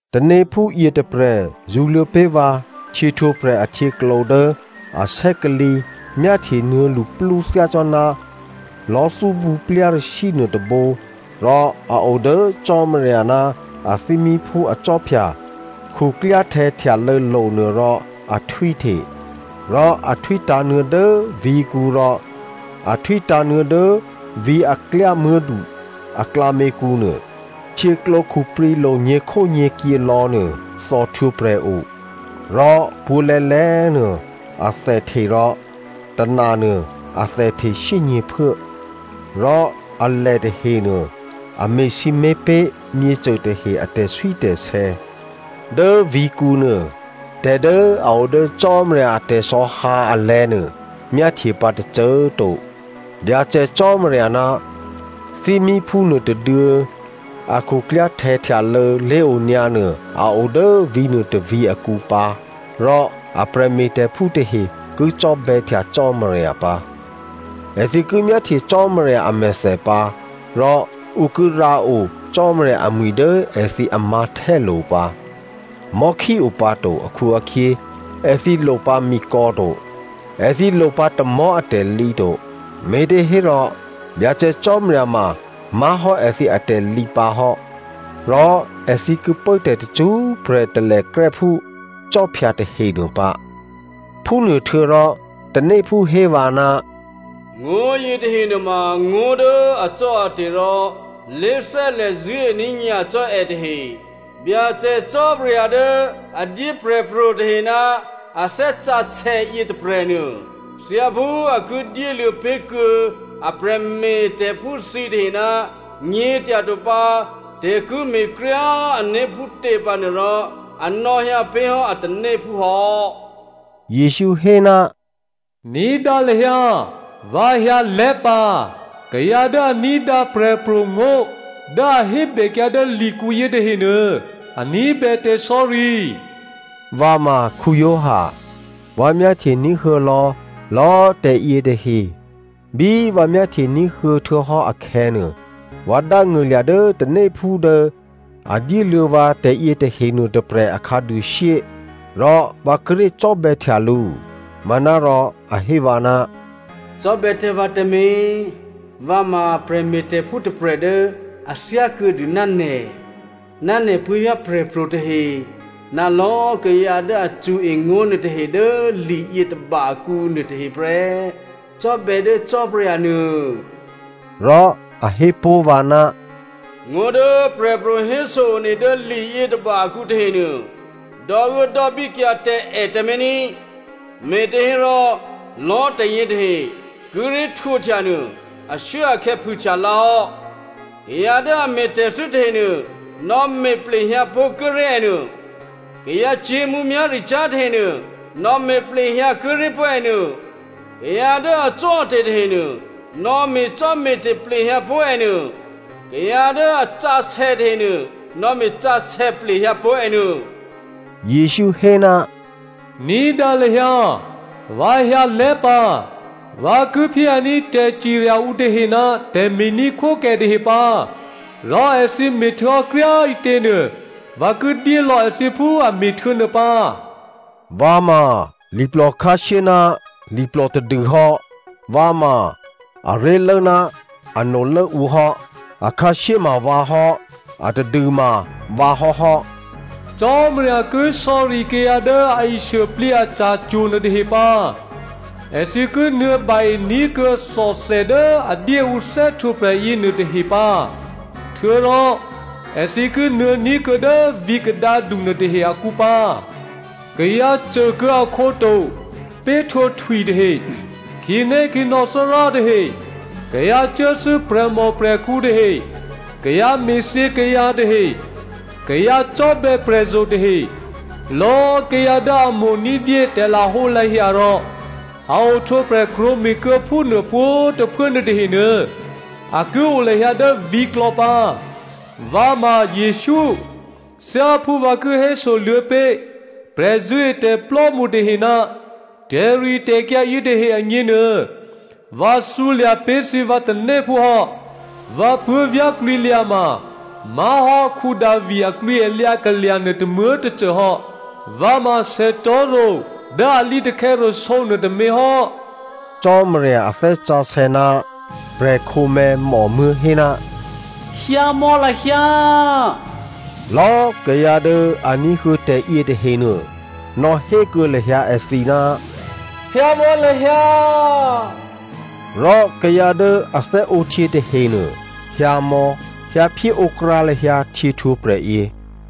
Tanéphú yětôprè̤ zṳ̌luô̌ pé̤ vǎ htyěhtwǒprè̤ ahtyěklǒ dố a sè́kalǐ myáhtye nuô̌ luplú thyácò́ná lò̤́thúbǔ plyarashyǐ nuôtôbǒ rò a o dố Cò́marya ná athímíphú akhwí khuklyáhtè̌ htyalô̌lo̤nuô rò a htwíhte. Rò a htwítǎ̤nuô̌ dố vǐ̤kǔ rò a htwítǎ̤nuô̌ dố vǐ̤ a klyámuố̤du aklǎměkǔ nuô. Htyěklǒ khuprǐlo̤ nyě̤khónyě̤kyě lò̌nuô thòhtwǒprè̤ o. Rò pwǒ̤lè̌lè̌꤮ nuô athèhte rò tônanuô athèhte shyényě̤phuố. Rò alè tahenuô a me̤sǐmé̤ pé̤ myěcô tahe a tè̤swítè̤sè̌. Dố vǐ̤kǔnuô tè̤ dố a o dố Cò́marya a tè̤sò̌hǎ alè̤̌nuô myáhtye pǎ tôcô꤮ to. Byacè Cò́marya ná thímíphú nuôtôduô̌ a khuklyáhtè̌ htyalô̌ lé̤onyǎ nuô a o dố vǐ̤nuô tôvǐ̤ akǔ pǎ rò a prè̤me̤tè̤phú tahe ki cò́bè̌htya Cò́marya pǎ. Èthǐ ki myáhtye Cò́marya amèthè pǎ rò ǔ ki rǎo Cò́marya amwi̤ dố èthǐ amǎ̤htè́lo̤ pǎ. Mò̤́khí o pǎ to akhu-akhyě èthǐ lopǎ mikò̌ to. Èthǐ lopǎ tamò̤́ atè̤lǐ to, me̤těhérò Byacè Cò́marya ma má̤hò́ èthǐ atè̤lǐ pǎ hò́, rò èthǐ ki pố tè̤ tacṳ́prè̤ talèkrè́ phú khwí tahenuô pǎ. Phúnuôhtuô̌rò tanéphú hé vǎ, “Ngó̤ yětahe nuôma ngó̤ dố acò́ate̤ rò lé̤thè́lè̤ zṳ̂́ení̤ nyacò́ è tahe. Byacè Cò́marya dố a dyé prè̤pro̤ tahe ná a Thè́ Sǎsè̌ yětôprè̤nuô, thyáphú a ki dyéluô̌ pé̤ kuô̌ a prè̤me̤tè̤phú thǐtahe ná nyě̤tyato pǎ tè̤ ki me̤kryá꤮ ané̤ phútě pǎ nuô rò, a nò̌hyǎ pé̤ hò́ a tanéphú hò́.” Jesǔ hé, “Ní̤dǎ lahyǎ꤮, vǎ hyǎlè́ pǎ, kayǎ dố a ní̤dǎ prè̤pro̤ngó̤ dố a hébèkyǎ dố likǔ yětahenuô, a ní̤bè tè̤sò̌ri.” Vǎ ma Giovanni. Vǎ myáhtye ní̤huô̌ lò̌lò̌꤮ tè̤yě tahe. Bí vǎ myáhtye ní̤huô̌ htuô̌hò́ akhè̌nuô, vǎ dángṳ̂lya̤ dố tanéphú dố a dyéluô̌ vǎ tè̤yě tahe nuôtôprè̤ a khǎduôshyé, rò vǎ kíré̤ cò́bè̌htya lǔ. Manárò a hé vǎ, “Cò́bè̌ tǎ vǎ tǎmé̤, vǎ ma prè̤me̤tè̤phú tôprè̤ dố a thyákuô̌dû ná nè̤ ná nè̤ puố̤vyá̤ prè̤pro̤ tahe, ná lò̌꤮ kayǎ dố a cṳ̌e ngó̤ nuôtahe dố li yětôba akǔ nuôtahe prè́. Cò́bè̌ dố Cò́marya nuô.” Rò a hé pó̤ vǎ, “Ngó̤ dố prè̤pro̤ héso one dố liyětôba akǔ tahenuô, dò́uốdò́bíkyǎ tǎ è tǎmé̤ ní꤮, me̤těhérò lò̌꤮ tè̤yě tahe kíré̤ htwǒhtya nuô ashuốakhè̌ phûhtya lǎ hò́. Kayǎ dố a me̤tè̤thû́ tahenuô nò̌me̤ plehyǎ pó̤ kuốré̤ ènuô. Kayǎcyě̤ mǔmyá̤ricyá̤ tahenuô nò̌me̤ plehyǎ kuốré̤ pó̤ ènuô. Kayǎ dố acò́ate̤ tahenuô nò̌me̤cò́me̤te̤ plehyǎ pó̤ ènuô. Kayǎ dố a sǎsè̌ tahenuô nò̌me̤ sǎsè̌ plehyǎpó̤ ènuô.” Jesǔ hé, “Ní̤dǎ lahyǎ꤮, vǎ hyǎlè́ pǎ, vǎ ki phyéhyǎní̤ tè̤cirya ǔ tahe ná tè̤me̤ní̤khwókè tahe pǎ. Rò èthǐ me̤htuô̌hò́ kryá꤮ ǐtěnuô, vǎ ki dyélò̌ èthǐ phú a me̤htuô̌ nuô pǎ. Vǎ ma liplò khǎshyé ná liplò tadû hò́. Vǎ ma aré̤lố ná anolố ǔ hò́. Akhǎshyé ma vǎ hò́, atadû ma vǎ hò́hò́. “Cò́marya ki sò̌ri kayǎ dố a ishuôplǐ aca̤cwo̤ nuôtahe pǎ. Èthǐ ki nuô̌ ba-e ní̤kuô̌ thòthè dố a dyé ǔ thè́htwǒprè̤ yěnuô tahe pǎ. Htuô̌rò èthǐ ki nuô̌ ní̤kuô̌ dố vǐ̤ kadǎdu nuôtahe akǔ pǎ. Kayǎ côkuô̌ akhǒ to péhtwǒ htwi tahe, khǐnékhǐnò̌ Thárá tahe, kayǎ cuốthû́ prè̤mòprè̤khǔ tahe, kayǎ me̤thyě kayǎ tahe, kayǎ cò́bè̌ prè̤zo̤ tahe, lò̌꤮ kayǎ dố a mo̤ ní̤dyé tè̤lahǒlahya rò a ohtwǒprè̤ krwǒme̤kuô̌ phúnuô pwǒ̤꤮ tôphuố nuôtahenuô a ki o lahyǎ dố vǐ̤klò̌ pǎ. “Vǎ ma Jesǔ. Thyáphú vǎ ki héso luô̌pé̤ prè̤zṳ̂́etè̤plò́mṳ tahe ná tè̤ritè̤kyǎ yětahe agněnuô, vǎ thǔlya̤ pé̤ thǐ vǎ tanéphú hò́. Vǎ puố̤vyá̤ klwǐlyǎ ma má̤hò́ Davi aklwǐalyǎ kalya̤ nuô tômuố̤tôcô hò́. Vǎ ma sètò̤́ro̤ dố a lǐtakhè̌rasǒ nuôtômě hò́.” Cò́marya a Thè́ Sǎsè̌ ná prè̤khǒmè̤̌ mòmuố̤ hé, “Hyǎmò̌ lahyǎ.” Lò̌꤮ kayǎ dố a ní̤huô̌ tè̤ yětahenuô, nò̌hékuô̌ lahyǎ èthǐ, “Hyǎmò̌ lahyǎ.” Rò kayǎ dố a thè́ǒhtyě tahenuô, hyǎmò̌, hyǎphyé ǒ krǎ lahyǎ htyě htwǒprè̤yě.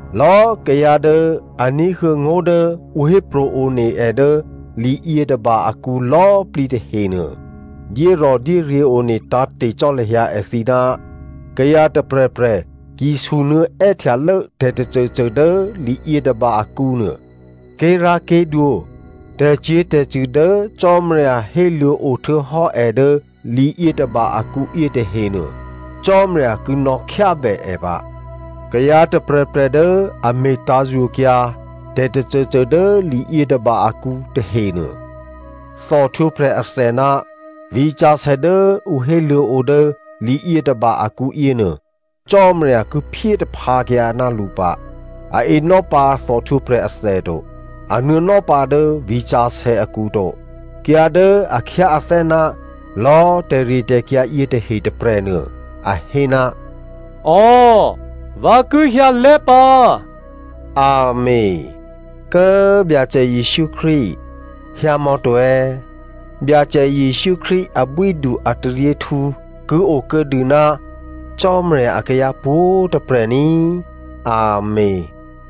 Lò̌꤮ kayǎ dố a ní̤huô̌ ngó̤ dố ǔ hépro̤ one è dố liyětôba akǔ lò̌꤮ plǐ tahenuô, dyérò̤dyéryě̤ one tǎ̤te̤ cò́ lahyǎ èthǐ, kayǎ tôprè̤prè̤ ki sunuô̌ è́htyalố tè̤tôcôcô dố liyětôba akǔnuô, ké̤rá̤ké̤dwǒ, tè̤cyě̤tè̤cṳ̂ dố Cò́marya héluô̌o htuô̌hò́ è dố liyětôba akǔ yětahenuô Cò́marya ki nò̌khyábè è pǎ. Kayǎ tôprè̤prè̤ dố a me̤tǎ̤yokyǎ tè̤tôcôcô dố liyětôba akǔ tahenuô, thòhtwǒprè̤ athè ná vǐ̤sǎsè̌ dố ǔ héluô̌o dố liyětôba akǔ yěnuô Cò́marya ki phyé taphǎkyǎ ná lǔ pǎ. A enò́pǎ thòhtwǒprè̤ athè to. A nuô̌nò́ pǎ dố vǐ̤sǎsè̌ akǔ to. Kayǎ dố a khyáathè́ ná lò̌꤮ tè̤ritè̤kyǎ yětahe tôprè̤nuô, a hé, “Ò, vǎ ki hyǎlè́ pǎ,” Amèn, Kố꤮ Byacè Jesǔ Krístu, hyǎmò̌ to꤮. Byacè Jesǔ Krístu abwídu ataryěhtǔ ki okuô̌dû ná Cò́marya akayǎ pwǒ̤꤮ tôprè̤ ní꤮. Amèn.